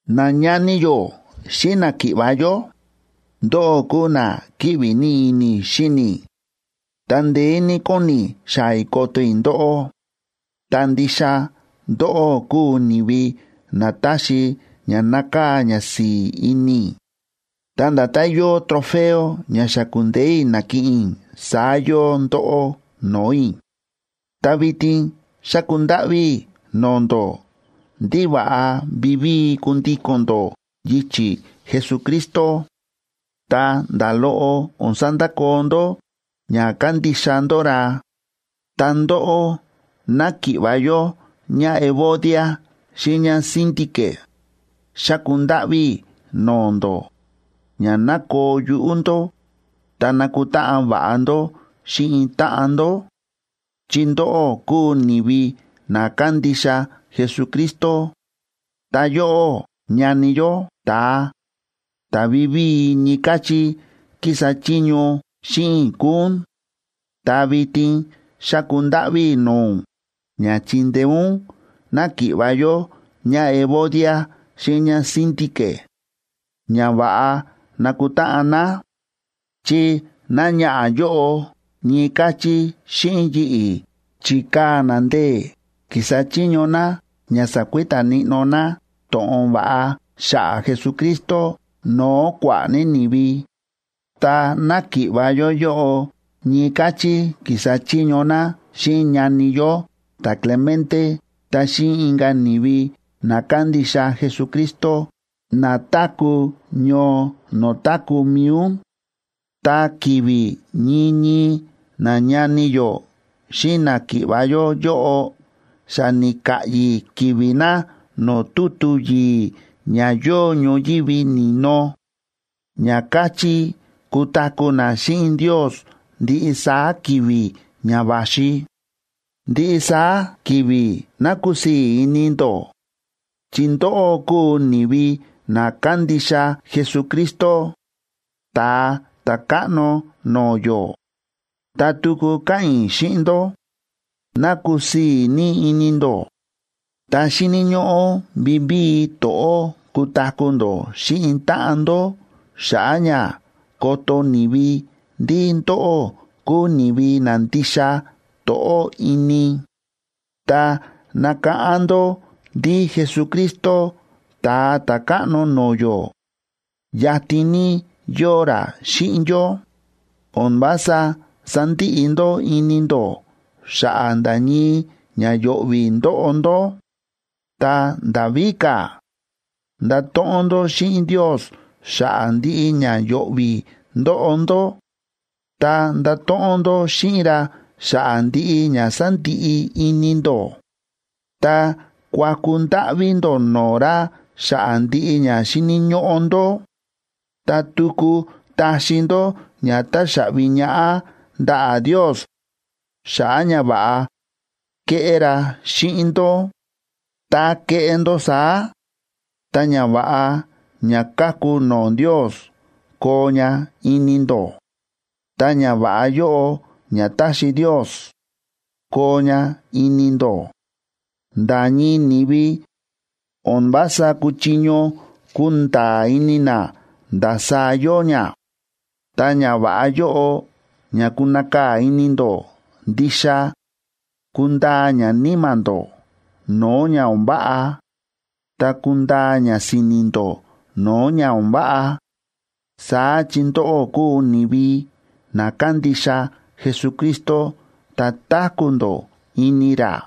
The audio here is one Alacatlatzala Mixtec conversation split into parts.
Nañani yó xíꞌin náki̱ꞌva̱ yó, ndóꞌó kúu na kíꞌvi ní ini i̱ xíni i̱, ta ndeé ní kóni i̱ xaa̱ i̱ koto i̱ ndóꞌó. Ta ndixa ndóꞌó kúu ni̱vi na táxi ña nákaa̱ ñasi̱i̱ ini i̱, ta nda̱tán yóo trofeo ña xa ku̱ndeé i̱ na̱kiꞌin i̱, saá yóo ndóꞌó no̱o̱ i̱. Ta vitin xáku ndáꞌví i̱ no̱o̱ ndó ndí va̱ꞌa vivíi kundíko̱n ndó yichi̱ Jesucristo, ta nda̱ loꞌo o̱n sandakoo ndó ña kándixa ndó ra. Ta ndóꞌó, náki̱ꞌva̱ yó ñáEvodia xíꞌin ñáSíntique, xáku ndáꞌví i̱ no̱o̱ ndó ña ná koo yuꞌú ndó ta nakutáꞌan va̱ꞌa ndó xíꞌin táꞌan ndó, chi ndóꞌó kúu ni̱vi na kándixa Jesucristo. Ta yóꞌó, ñani yó, ta̱a ta̱ vivíi ñii káchí kísa chiño xíꞌin i̱ kúu ún, ta vitin xáku ndáꞌví i̱ no̱o̱ ún ña chindeé ún náki̱ꞌva̱ yó ñáEvodia xíꞌin ñáSíntique ña va̱ꞌa nakutáꞌan ná, chi náñaꞌa̱ yóꞌo ñii káchí xíꞌin yi̱ꞌi̱, chi̱kaa̱ ná ndee̱ ki̱sa chiño ná ña sakuita níꞌnó ná to̱ꞌon va̱ꞌa xa̱ꞌa̱ Jesucristo no̱o̱ kua̱ꞌa̱ ní ni̱vi. Ta náki̱ꞌva̱ yó yóꞌo ñii káchí ki̱sa chiño ná xíꞌin ñani yó ta̱Clemente ta xíꞌin inka̱ ni̱vi na kándixa Jesucristo na táku̱ ñoo no̱o̱ táku̱ mi̱i ún. Ta ki̱vi̱ ñii ñii nañani yó xíꞌin náki̱ꞌva̱ yó yóꞌo xa ni̱ka̱ꞌyi̱ ki̱vi̱ na no̱o̱ tutu yi̱i̱ ña yóo ñoyívi ni̱no, ña káchí kutaku̱ na xíꞌin Ndios ndiꞌi saá ki̱vi̱ ña va̱xi. Ndiꞌi saá ki̱vi̱ ná kusii̱ ini ndó, chi ndóꞌó kúu ni̱vi na kándixa Jesucristo, Ta̱a Ta̱káꞌno no̱o̱ yó. Ta tuku káꞌa̱n i̱ xíꞌin ndó: ¡Ná kusii̱ ní ini ndó! Ta xíni̱ ñóꞌó vivíi to̱ꞌó kutaku̱ ndó xíꞌin táꞌan ndó xa̱ꞌa̱ ña koto ni̱vi ndí ndóꞌó kúu ni̱vi na ndixa to̱ꞌó ini. Ta nakáꞌán ndó ndí Jesucristo, Ta̱a Ta̱káꞌno no̱o̱ yó, yatin ní yóo ra xíꞌin yó. O̱n vása sandiꞌi ndó ini ndó xa̱ꞌa̱ nda̱ ñii ña yo̱ꞌvi̱ ndóꞌo ndó, ta nda̱ víka̱, ndato̱ꞌon ndó xíꞌin Ndios xa̱ꞌa̱ ndiꞌi ña yo̱ꞌvi̱ ndóꞌo ndó ta ndato̱ꞌon ndó xíꞌin ra xa̱ꞌa̱ ndiꞌi ña sándiꞌi ini ndó, ta kuaku ndáꞌví ndó no̱o̱ ra xa̱ꞌa̱ ndiꞌi ña xíni̱ ñóꞌó ndó. Ta tuku taxi ndó ña táxaꞌvi ñaꞌá ndaꞌa̱ Ndios xa̱ꞌa̱ ñava̱ꞌa kéꞌé ra xíꞌin ndó. Tá keꞌé ndó saá, ta ñava̱ꞌa ña káku no̱o̱ Ndios koo ña ini ndó. Ta ñava̱ꞌa yóꞌo ña taxi Ndios koo ña ini ndó, nda̱ ñii ni̱vi o̱n vása kúchiño kunda̱a̱ ini na ndasaá yóo ña. Ta ñava̱ꞌa yóꞌo ña kunakaa̱ ini ndó ndixa kundaa ña níma̱ ndó no̱o̱ ña o̱n váꞌa ta kundaa ña si̱ni̱ ndó no̱o̱ ña o̱n váꞌa, saá chi ndóꞌó kúu ni̱vi na kándixa Jesucristo ta táku̱ ndó ini ra.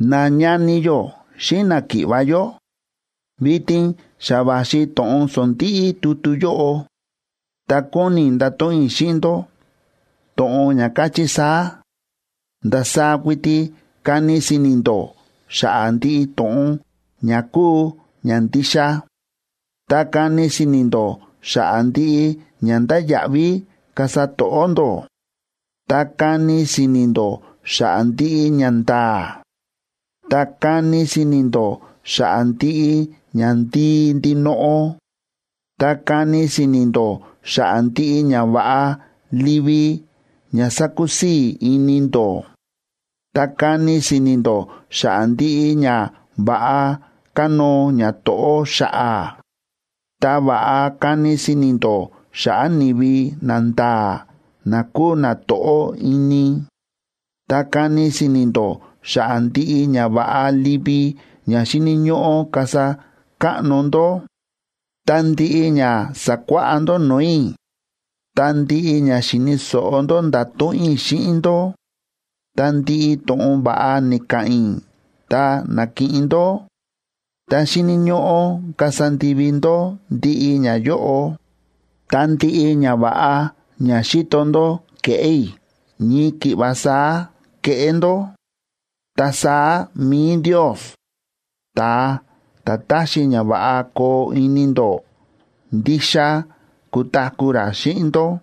Nañani yó xíꞌin náki̱ꞌva̱ yó, vitin xa va̱xi to̱ꞌon sondíꞌí tutu yóꞌo, ta kóni i̱ ndato̱ꞌon i̱ xíꞌin ndó to̱ꞌon ña káchí saá: Ndasaá kuiti kani si̱ni̱ ndó xa̱ꞌa̱ ndiꞌi to̱ꞌon ña kúu ña ndixa, ta kani si̱ni̱ ndó xa̱ꞌa̱ ndiꞌi ña ndáya̱ꞌví kasa to̱ꞌó ndó, ta kani si̱ni̱ ndó xa̱ꞌa̱ ndiꞌi ñanda̱a̱, ta kani si̱ni̱ ndó xa̱ꞌa̱ ndiꞌi ñandii ndinoꞌo, ta kani si̱ni̱ ndó xa̱ꞌa̱ ndiꞌi ñava̱ꞌa livi ña sákusii̱ ini ndó, ta kani si̱ni̱ ndó xa̱ꞌa̱ ndiꞌi ñava̱ꞌa kánóo ñato̱ꞌó xa̱ꞌa̱. Ta va̱ꞌa kani si̱ni̱ ndó xa̱ꞌa̱ ni̱vi nanda̱a̱ na kúu na to̱ꞌó ini, ta kani si̱ni̱ ndó xa̱ꞌa̱ ndiꞌi ñava̱ꞌa livi ña xíni̱ ñóꞌó kasa káꞌno ndó. Ta ndiꞌi ña sa̱kuáꞌá ndó no̱o̱ i̱, ta ndiꞌi ña xi̱ni̱ so̱ꞌo ndó nda̱to̱ꞌon i̱ xíꞌin ndó, ta ndiꞌi to̱ꞌon va̱ꞌa ni̱ka̱ꞌa̱n i̱ ta na̱kiꞌin ndó, ta xíni̱ ñóꞌó kasa ndivi ndó ndiꞌi ñayóꞌo. Ta ndiꞌi ñava̱ꞌa ña xi̱to ndó ke̱ꞌé i̱, ñii ki̱ꞌva saá keꞌé ndó. Ta saá mi̱i Ndios, ta̱a ta̱ táxi ña va̱ꞌa koo ini ndó, ndixa kutaku̱ ra xíꞌin ndó.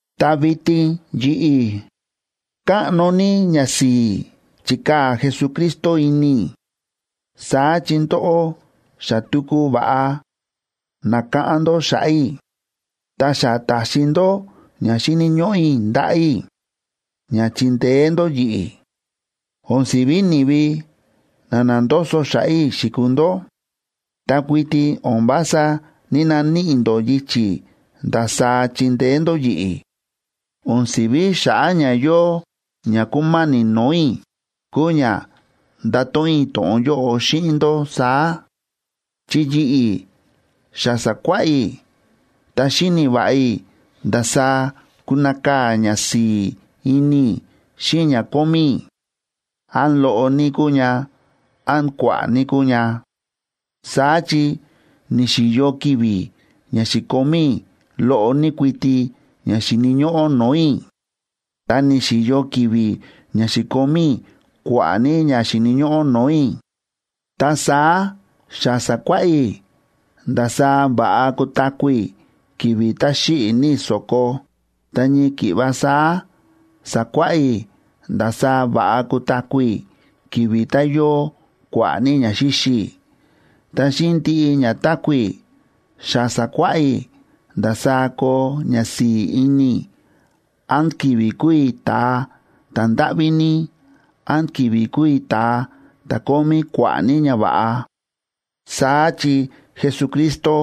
Ta vitin yi̱ꞌi̱, káꞌno ní ñasi̱i̱ chi̱kaa̱ Jesucristo ini i̱, saá chi ndóꞌó xa tuku va̱ꞌa nákáꞌán ndó xa̱ꞌa̱ i̱, ta xa ta̱xi ndó ña xíni̱ ñóꞌó i̱ ndaꞌa̱ i̱ ña chi̱ndeé ndó yi̱ꞌi̱. O̱n si̱ví ni̱vi na na̱ndoso xa̱ꞌa̱ i̱ xi̱kuu ndó, ta kuiti o̱n vása ní‑naníꞌi ndó yichi̱ ndasaá chindeé ndó yi̱ꞌi̱. O̱n si̱ví xa̱ꞌa̱ ña yóo ña kúma̱ni̱ no̱o̱ i̱, kúu ña ndáto̱ꞌon i̱ to̱ꞌon yóꞌo xíꞌin ndó saá. Chi yi̱ꞌi̱ xa sa̱kuáꞌá i̱, ta xíni̱ va̱ꞌa i̱ ndasaá kunakaa̱ ñasi̱i̱ ini i̱ xíꞌin ña kómí i̱, án loꞌo ní kúu ña, án kua̱ꞌa̱ ní kúu ña. Saá chi ni̱xi̱yo ki̱vi̱ ña xi̱komí i̱ loꞌo ní kuiti ña xíni̱ ñóꞌó no̱o̱ i̱, ta ni̱xi̱yo ki̱vi̱ ña xi̱komí i̱ kua̱ꞌa̱ ní ña xíni̱ ñóꞌó no̱o̱ i̱. Ta saá xa sa̱kuáꞌá i̱ ndasaá va̱ꞌa kutaku̱ i̱ ki̱vi̱ tá xíꞌi̱ ní i̱ so̱ko, ta ñii ki̱ꞌva saá sa̱kuáꞌá i̱ ndasaá va̱ꞌa kutaku̱ i̱ ki̱vi̱ tá yóo kua̱ꞌa̱ ní ña xíxi i̱. Ta xíꞌin ndiꞌi ña táku̱ i̱, xa sa̱kuáꞌá i̱ ndasaá koo ñasi̱i̱ ini i̱ án ki̱vi̱ kúu i̱ ta̱a ta̱ndáꞌví ní, án ki̱vi̱ kúu i̱ ta̱a ta̱ kómí kua̱ꞌa̱ ní ñava̱ꞌa. Saá chi Jesucristo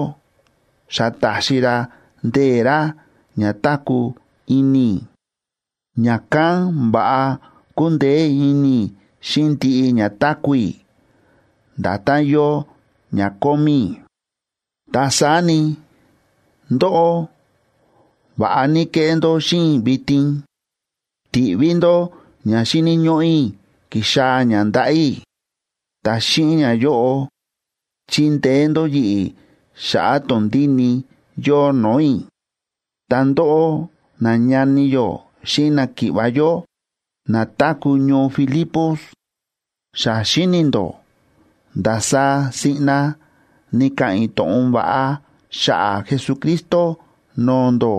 xa ta̱xi ra ndee̱ ra ña táku̱ ini i̱, ña̱kán va̱ꞌa kúndeé ini i̱ xíꞌin ndiꞌi ña táku̱ i̱, nda̱tán yóo ña kómí i̱. Ta saá ni, ndóꞌó va̱ꞌa ní ke̱ꞌé ndó xíꞌin i̱ vitin, ti̱ꞌví ndó ña xíni̱ ñóꞌó i̱ ki̱xaa̱ ña ndaꞌa̱ i̱, ta xíꞌin ñayóꞌo, chi̱ndeé ndó yi̱ꞌi̱ xa̱ꞌa̱ tondíni yóo no̱o̱ i̱. Ta ndóꞌó, nañani yó xíꞌin náki̱ꞌva̱ yó na táku̱ ñoo Filipos, xa xíni̱ ndó ndasaá siꞌna ni̱ka̱ꞌa̱n i̱ to̱ꞌon va̱ꞌa xa̱ꞌa̱ Jesucristo no̱o̱ ndó.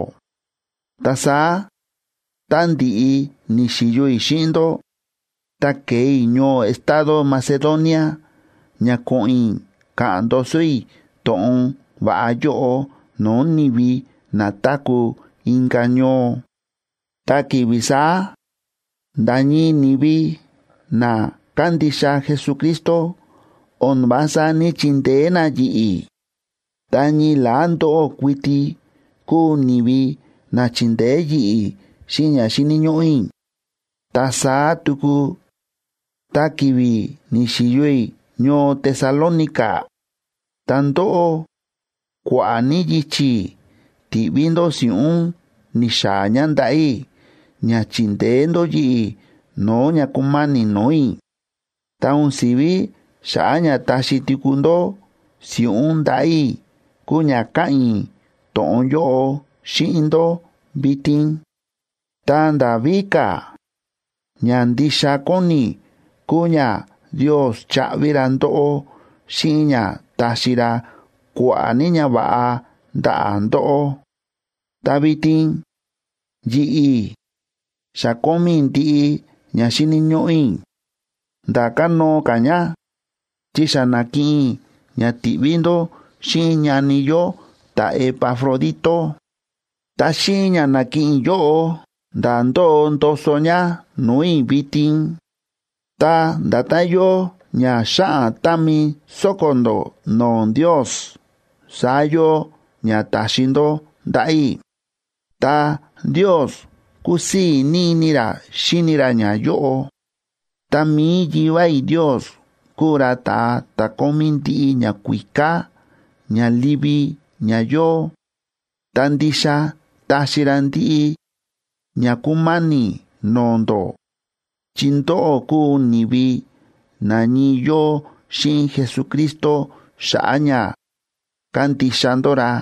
Ta saá tá ndi̱ꞌi ni̱xi̱yo i̱ xíꞌin ndó ta ke̱e i̱ ñoo estado Macedonia ña ko̱ꞌo̱n i̱ ka̱ꞌa̱n ndoso i̱ to̱ꞌon va̱ꞌa yóꞌo no̱o̱ ni̱vi na táku̱ inka̱ ñoo, ta ki̱vi̱ saá nda̱ ñii ni̱vi na kándixa Jesucristo o̱n vása ní‑chindeé na yi̱ꞌi̱, ta ñii la̱á ndóꞌó kuiti kúu ni̱vi na chi̱ndeé yi̱ꞌi̱ xíꞌin ña xíni̱ ñóꞌó i̱. Ta saá tuku tá ki̱vi̱ ni̱xi̱yo i̱ ñoo Tesalónica, ta ndóꞌó kua̱ꞌa̱ ní yichi̱ ti̱ꞌví ndó si̱ꞌún ni̱xaa̱ ña ndaꞌa̱ i̱ ña chi̱ndeé ndó yi̱ꞌi̱ no̱o̱ ña ku̱ma̱ni̱ no̱o̱ i̱. Ta o̱n si̱ví xa̱ꞌa̱ ña taxi tuku ndó si̱ꞌún ndaꞌa̱ i̱ kúu ña káꞌa̱n i̱ to̱ꞌon yóꞌo xíꞌin ndó vitin. Ta nda̱ víka̱, ña ndixa kóni i̱ kúu ña Ndios chaꞌvi ra ndóꞌó xíꞌin ña taxi ra kua̱ꞌa̱ ní ñava̱ꞌa ndaꞌa̱ ndóꞌó. Ta vitin yi̱ꞌi̱ xa kómí i̱ ndiꞌi ña xíni̱ ñóꞌó i̱, nda̱ kánóo ka̱ ña, chi xa na̱kiꞌin i̱ ña ti̱ꞌví ndó xíꞌin ñani yó ta̱Epafrodito. Ta xíꞌin ña na̱kiꞌin i̱ yóꞌo, nda̱ ndóo ndoso ña no̱o̱ i̱ vitin. Ta nda̱tán yóo ña xáꞌan támi sóko̱ ndó no̱o̱ Ndios, saá yóo ña ta̱xi ndó ndaꞌa̱ i̱, ta Ndios kúsii̱ ní ini ra xíni ra ñayóꞌo. Ta mi̱i Yivá i̱ Ndios kúu ra ta̱a ta̱ kómí ndiꞌi ñakuíká ña livi ña yóo, ta ndixa taxi ra ndiꞌi ña kúma̱ni̱ no̱o̱ ndó, chi ndóꞌó kúu ni̱vi na ñii yóo xíꞌin Jesucristo xa̱ꞌa̱ ña kándixa ndó ra.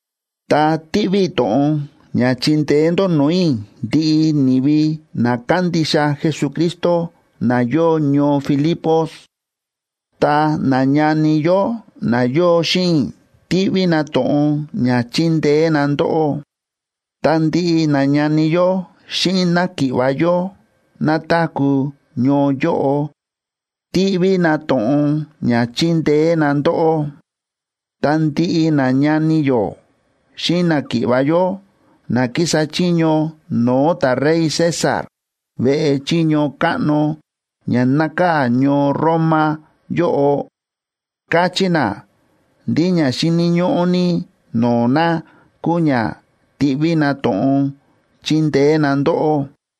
Ta tíꞌví i̱ to̱ꞌon ña chindeé ndó no̱o̱ i̱ ndiꞌi ni̱vi na kándixa Jesucristo na yóo ñoo Filipos. Ta nañani yó na yóo xíꞌin i̱ tíꞌví na to̱ꞌon ña chindeé na ndóꞌó. Ta ndiꞌi nañani yó xíꞌin náki̱ꞌva̱ yó na táku̱ ñoo yóꞌo tíꞌví na to̱ꞌon ña chindeé na ndóꞌó. Ta ndiꞌi nañani yó xíꞌin náki̱ꞌva̱ yó na kísa chiño no̱o̱ ta̱rey César veꞌe chiño káꞌno ña nákaa̱ ñoo Roma yóꞌo, káchí na ndí ña xíni̱ ñóꞌó ní no̱o̱ na kúu ña tíꞌví na to̱ꞌon chindeé na ndóꞌó.